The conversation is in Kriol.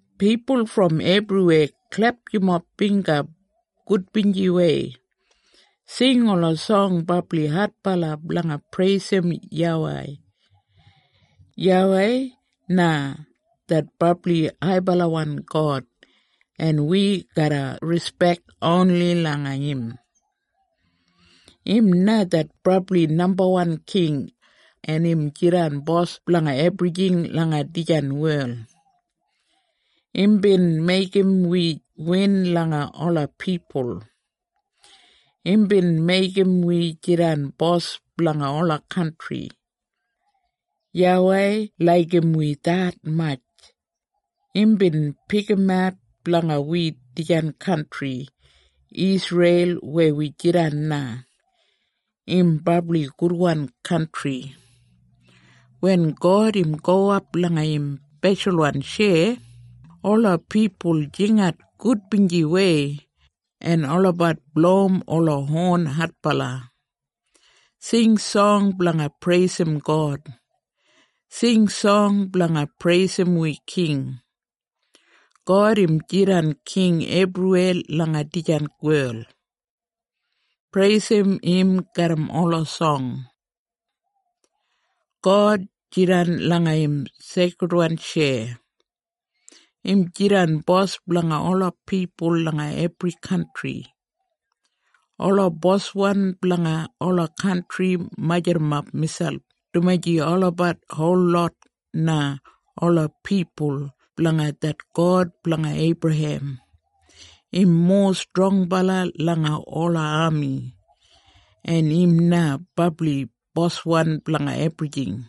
Pipul brom ebriweya, klep yumob bingga gudbinjiwei. Sing ola song brabli adbala blanga preisim YAWEI. YAWEI na det brabli haibalawan God en wi garra rispek oni langa im. Im na det brabli nambawan king, en im jidan bos blanga ebrijing langa dijan wel. Imbin meigim wi win langa ola pipul. Imbin meigim wi jidan bos blanga ola kantri. YAWEI laigim wi detmatj. Imbin pikimat blanga wi dijan kantri Isreil weya wi jidan na. Im brabli gudwan kantri. Wen God im gowap langa im speshalwan tjeya, ola pipul jingat gudbinjiwei, en olabat blowim ola hon adbala. Sing song blanga preisim God! Sing song blanga preisim wi king! God im jidan king ebriweya langa dijan wel. Preisim im garram ola song. God jidan langa im seikridwan tjeya. Im jidan bos blanga ola pipul langa ebri kantri. Ola boswan blanga ola kantri majurrumap miselp dumaji olabat holot na ola pipul blanga det God blanga Eibrahem. Im mowa strongbala langa ola ami, en im na brabli boswan blanga ebrijing.